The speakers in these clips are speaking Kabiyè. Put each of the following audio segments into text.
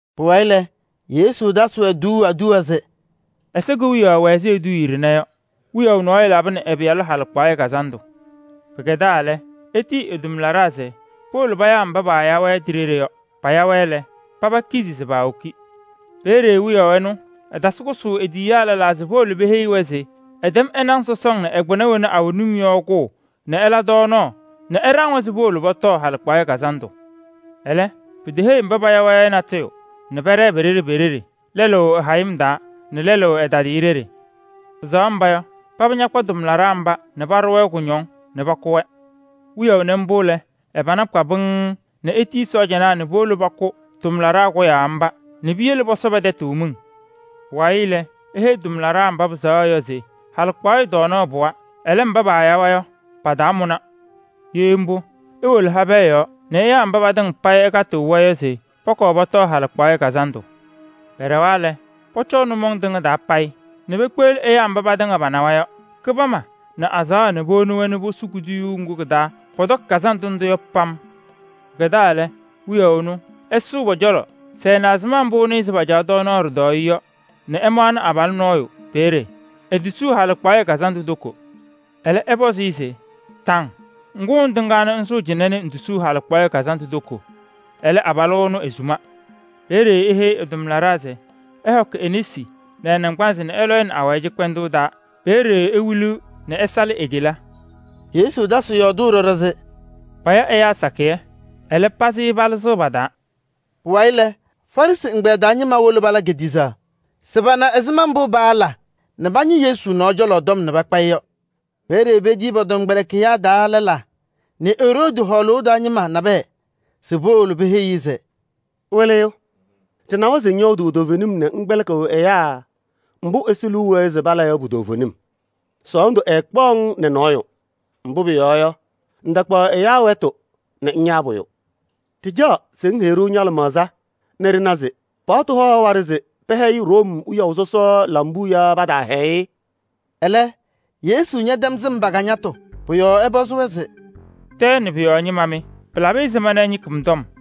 Pʋwayɩ lɛ, Yesu tasɩ-wɛ tuuu aduwa se: “Ɛsɔ Kewiyaɣ wɛ ɛzɩ eduuye ɖɩnɛ yɔ: wiyaʋ nɔɔyʋ labɩnɩ ɛ-pɩyalʋ halɩkpaɣyɛ kazandʋ. Pɩkɛdaa lɛ, etiyi ɛ-tʋmlaɖaa se powolo payaa mba paaya-wɛ ti-ɖeɖe yɔ. Paya-wɛ lɛ, paba kizi se paawoki. Peeye wiyaʋ ɛnʋ ɛtasɩ kʋsʋʋ e-tiyiyaa lɛlaa se powolo peheyi-wɛ se ɛtɛm ɛ-naŋ sɔsɔŋ nɛ ɛ-kpɩna wena awɛ num yɔ kʋʋ nɛ ɛla tɔɔnaɣ nɛ ɛɖaŋnɩ-wɛ se powolo pɔtɔɔ halɩkpaɣyɛ kazandʋ! Ɛlɛ, piteheyi mba paaya-wɛ yɔ natʋyʋ nɛ pɛɖɛɛ pe-ɖeɖe pe-ɖeɖe: lɛlʋ ɛ-hayɩm taa nɛ lɛlʋ ɛ-tadɩyɛ ɖeɖe. Pɩsɛɣ mba yɔ, paba ñakpa tʋmlaɖaa mba nɛ paɖʋ-wɛ kʋñɔŋ nɛ pakʋ-wɛ. Wiyaʋ nɩ mbʋ lɛ, ɛ-pana kpa pɩŋŋ nɛ etiyi ɛ-sɔɔjanaa nɛ powolo pakʋ ɛ-tʋmlaɖaa kʋyaa mba nɛ piyele pɔsɔ pɛ-tɛtʋ miŋ. “Pʋwayɩ lɛ, eheyi ɛ-tʋmlaɖaa mba pɩsɛɣa yɔ se: ‘Halɩkpaɣyɛ tɔɔnaɣ pɩwa, ɛlɛ, mba paaya-wɛ yɔ, pataamʋna. Ye mbʋ, iwolo habɛɛ yɔɔ nɛ ɩyaa mba patɩŋa payɩ ɩkatɩɣ-wɛ yɔ se pɔkɔɔ pɔtɔɔ halɩkpaɣyɛ kazandʋ.’ Pɛɖɛwa lɛ, pɔcɔɔ nʋmɔŋ tɩŋa taa payɩ nɛ pekpeɣli ɛyaa mba patɩŋa panawa yɔ: kɩbama nɛ azaɣa nɛ powoni-wɛ nɛ posu kuduyuu ŋgʋ kɩ-taa pɔtɔkɩ kazandʋ ndʋ yɔ pam. “Pɩkɛdaa lɛ, wiyaʋ ɛnʋ ɛsʋ pɔ-cɔlɔ se ɛna ɛzɩma mbʋ pacaɣ tɔɔnaɣ ɖɩtɔɔyɛ yɔ nɛ ɛmaɣnɩ abalʋ nɔɔyʋ peeye, etosuu halɩkpaɣyɛ kazandʋ toko. Ɛlɛ ɛpɔzɩ-ɩ se: ‘Taŋ! Ŋgʋ ŋtɩŋaa ŋsʋʋ cɩnɛ nɛ ŋtosuu halɩkpaɣyɛ kazandʋ toko?’ Ɛlɛ, abalʋ ɛnʋ esuma. Peeye eheyi ɛ-tʋmlaɖaa se: ‘Ɩhɔkɩ e-nesi nɛ ɛ-naŋgbanzɩ nɛ ɩlɔ-ɩ nɛ awayɩ cɩkpɛndʋʋ taa. Peeye ewiliɣ nɛ ɛsalɩ e-kela.’” Yesu tasɩ yɔɔdʋʋ ɖɔɖɔ se: “Paya ɛyaa sakɩyɛ, ɛlɛ, pazɩ palɩzɩɣ pa-taa.” Pʋwayɩ lɛ, Farɩsɩ ɛgbɛyɛ taa ñɩma wolo pala kediɣzaɣ se pana ɛzɩma mbʋ paala nɛ pañɩ Yesu nɔɔ cɔlɔ tɔm nɛ pakpa-ɩ yɔ. Peeye petiyi pɔ-tɔmkpɛlɩkɩyaa taa lɛlaa nɛ Eroodi hɔɔlʋʋ taa ñɩma nabɛyɛ se powolo peheyi-i se: “Wɩlɩyʋ! Ɖɩnawa se ŋyɔɔdʋʋ toovenim nɛ ŋkpɛlɩkɩɣ ɛyaa mbʋ Ɛsɔ liu wɛɛ se pala yɔ pu-toovenim. Sɔɔndʋ ɛɛkpaɣ-ŋ nɛ nɔɔyʋ, mbʋ pʋyɔɔ yɔ, ŋtakpaɣ ɛyaa wɛtʋ nɛ ŋyaa pʋyʋ. Ɖɩcaɣ se ŋheyi-ɖʋ ña-lɩmaɣza nɛ ɖɩna se: ɖa-paɣtʋ haɣ waɖɛ se pɛhɛyɩ Room wiyaʋ sɔsɔ lambuu yaa pataahɛyɩ-ɩ?” Ɛlɛ, Yesu ñɛtɛm sɩm pa-ajiitu mbʋ. Pʋ-yɔɔ ɛpɔzɩ-wɛ se: “Tɛɛ nɛ pʋ-yɔɔ ñɩma mɩ! Pɩlabɩ ɛzɩma ɩñɩkɩ mɔ-nɔɔ cɔlɔ tɔm?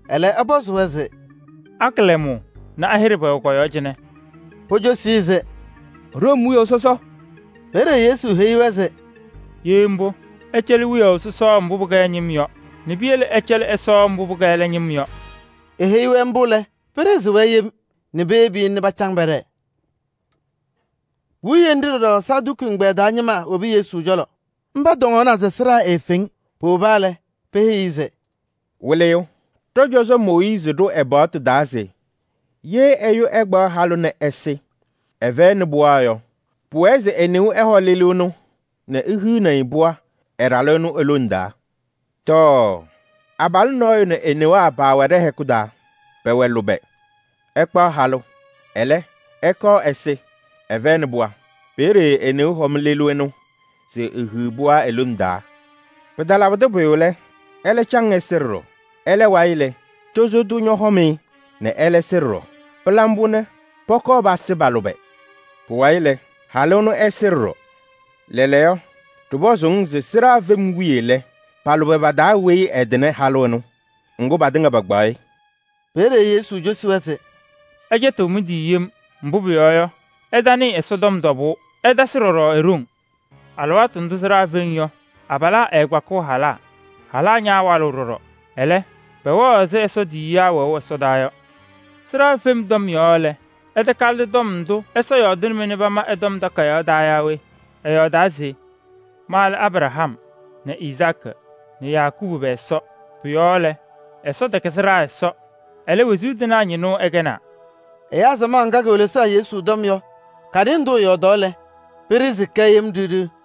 Ɛlɛ ɛpɔzɩ-wɛ se: “A-kɩlɛmʋʋ nɛ a-hɩɖɛ pɛwɛ kɔ-yɔɔ cɩnɛ?” Pocosi-i se: “Room wiyaʋ sɔsɔ.” Peeye Yesu heyi-wɛ se: “Ye mbʋ, ɩcɛlɩ wiyaʋ sɔsɔ mbʋ pɩkɛ ɛ-ñɩm yɔ nɛ piyele ɩcɛlɩ Ɛsɔ mbʋ pɩkɛ ɛlɛ ñɩm yɔ.” Eheyi-wɛ mbʋ lɛ, pɩɖɩɣzɩ-wɛ yem nɛ peyebi-i nɛ pacaŋ pɛɖɛɛ. Puwiye nɖɩ ɖɔɖɔ Saduki ɛgbɛyɛ taa ñɩma wobi Yesu cɔlɔ, mba tɔŋna se sɩɖaa eefeŋ. Powoba lɛ, peheyi-i se: “Wɩlɩyʋ! Ɖɔ-cɔzɔ Mooyiizi ɖʋ ɛ-paɣtʋ taa se: ‘Ye ɛyʋ ɛkpaɣ halʋ nɛ ɛsɩ, ɛfɛyɩnɩ pɩɣa yɔ, pʋwɛɛ se e-neu ɛhɔ lelu ɛnʋ nɛ ehiɣni-i pɩɣa ɛ-ɖalʋ ɛnʋ e-lone taa.’ Tɔɔ! Abalʋ nɔɔyʋ nɛ e-newaa paawɛ ɖɛ-hɛkʋ taa, pɛwɛ lʋbɛ, ɛkpaɣ halʋ. Ɛlɛ, ɛkɔɔ ɛsɩ, ɛfɛyɩnɩ pɩɣa. Peeye e-neu hɔm lelu ɛnʋ se ehiɣ pɩɣa e-lone taa. Pɩtalabɩdɩ pʋyʋ lɛ, ɛlɛ caŋ ɛsɩ ɖɔɖɔ. Ɛlɛ wayɩ lɛ, tozo tʋ ñɔhɔm-ɩ nɛ ɛlɛ sɩ ɖɔɖɔ. Pɩla mbʋ nɛ pɔkɔɔ pasɩ pa-lʋbɛ. Pʋwayɩ lɛ, halʋ ɛnʋ ɛsɩ ɖɔɖɔ. Lɛɛlɛɛyɔ, ɖɩpɔzʋʋ-ŋ se: sɩɖaa fem wiye lɛ, pa-lʋbɛ pa-taa weyi ɛtɩnɩ halʋ ɛnʋ? Ŋgʋ, patɩŋa pakpaɣ-ɩ.” Peeye Yesu cosi-wɛ se: “Ɩcɛtɩɣ mɩ-tɩ yem, mbʋ pʋyɔɔ yɔ, ɩtanɩɩ Ɛsɔtɔm tɔbʋʋ, ɩtasɩ ɖɔɖɔ e-ɖoŋ. Alɩwaatʋ ndʋʋ sɩɖaa feŋ yɔ, abalaa ɛɛkpakɩɣ halaa, halaa ñaawalɩɣ ɖɔɖɔ. Ɛlɛ, pɛwɛɣ ɛzɩ Ɛsɔ tiyiyaa wɛʋ ɛsɔdaa yɔ. Sɩɖaa fem tɔm lɛ, ɩtakalɩdɩ tɔm ndʋ Ɛsɔ yɔɔdɩnɩ-mɩ nɛ pama ɛ-Tɔm Takayaɣ taa yɔ yaa we? Ɛyɔɔdaa se: ‘Ma lɛ Abraham nɛ Izaakɩ nɛ Yakɔɔbʋ pɛ-Ɛsɔ.’ Pʋ-yɔɔ lɛ, Ɛsɔ tɛkɛ sɩɖaa Ɛsɔ, ɛlɛ, wezuu tɩnaa ñɩnʋ ɛkɛnaa.” Ɛyaa samaɣ ŋga kewelesaɣ Yesu tɔm yɔ, kanɩ ndʋ ɛyɔɔdaa yɔ lɛ, pɩɖɩɣzɩ-kɛ yem ɖɩɣ ɖɩɣ.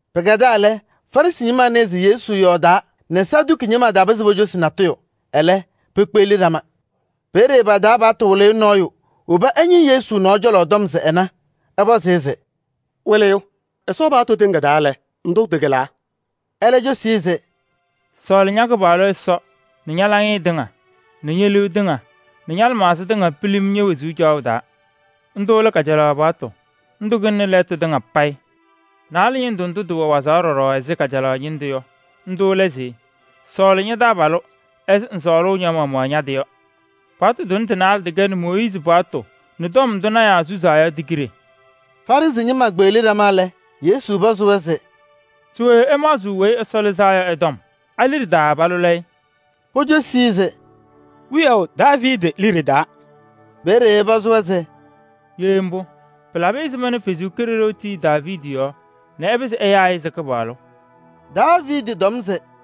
Pɩkɛdaa lɛ, Farɩsɩ ñɩma nɩɩ se Yesu yɔɔdaa nɛ Saduki ñɩma tapɩzɩ pocosi-i natʋyʋ, ɛlɛ pekpeɣli ɖama. Peeye pa-taa paɣtʋ wɩlɩyʋ nɔɔyʋ woba ɛñɩ Yesu nɔɔ cɔlɔ tɔm se ɛna, ɛpɔzɩ-ɩ se: “Wɩlɩyʋ! Ɛsɔ paɣtʋ tɩŋa taa lɛ, ndʋ tɩkɩlaa?” Ɛlɛ cosi-i se: “ ‘Sɔɔlɩ ña-Kɩpaɣlʋ Ɛsɔ nɛ ña-laŋɩyɛ tɩŋa nɛ ñe-liu tɩŋa nɛ ña-lɩmaɣza tɩŋa pilim ñe-wezuu caɣʋ taa.’ Ndʋ lɛ kajalaɣ paɣtʋ, ndʋ kɩlɩnɩ lɛɛtʋ tɩŋa payɩ. Naalɛ ñɩndʋ ndʋ tɩwɛ wazaɣ ɖɔɖɔ ɛzɩ kajalaɣ ñɩndʋ yɔ, ndʋ lɛ se: ‘Sɔɔlɩ ña-taabalʋ ɛzɩ ŋsɔɔlʋʋ ña-maɣmaɣ ña-tɩ yɔ.’ Paɣtʋ tʋnɛ tɩ-naalɛ tɩkɛnɩ Mooyiizi paɣtʋ nɛ tɔm ndʋ lɔɔyɩsɩ tɩnaa susuu yɔ ti-kiɖe.” Farɩsɩ ñɩma kpeɣli ɖama lɛ, Yesu pɔzɩ-wɛ se: “Se we ɩmaɣzɩɣ Weyi Ɛsɔ Lɩzaa Yɔ ɛ-tɔm? A-liɖe taa palʋlʋʋ-ɩ?” Pocosi-i se: “Wiyaʋ Daaviidi liɖe taa.” Peeye ɛpɔzɩ-wɛ se: “Ye mbʋ, pɩlabɩ ɛzɩma nɛ Ɛsɔ Kalɩzaɣ tii Daaviidi yɔɔ nɛ ɛpɩzɩ ɛyaa-ɩ se: ‘Kɩpaɣlʋ?’ Ɛtɔm se: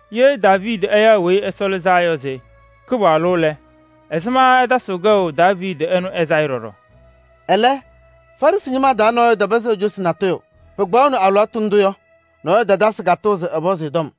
Ye Daaviidi ɛyaɣ Weyi Ɛsɔ Lɩzaa Yɔ se: ‘Kɩpaɣlʋ’ lɛ, ɛzɩma ɛtasɩɣ kɛʋ Daaviidi ɛnʋ ɛ-sayɩ ɖɔɖɔ yɔ?” Ɛlɛ, nɔɔyʋ tapɩzɩ ecosi-i natʋyʋ. Pɩkpaɣʋnɩ alɩwaatʋ ndʋ yɔ, nɔɔyʋ tatasɩ katʋʋ se ɛpɔzɩ-ɩ tɔm.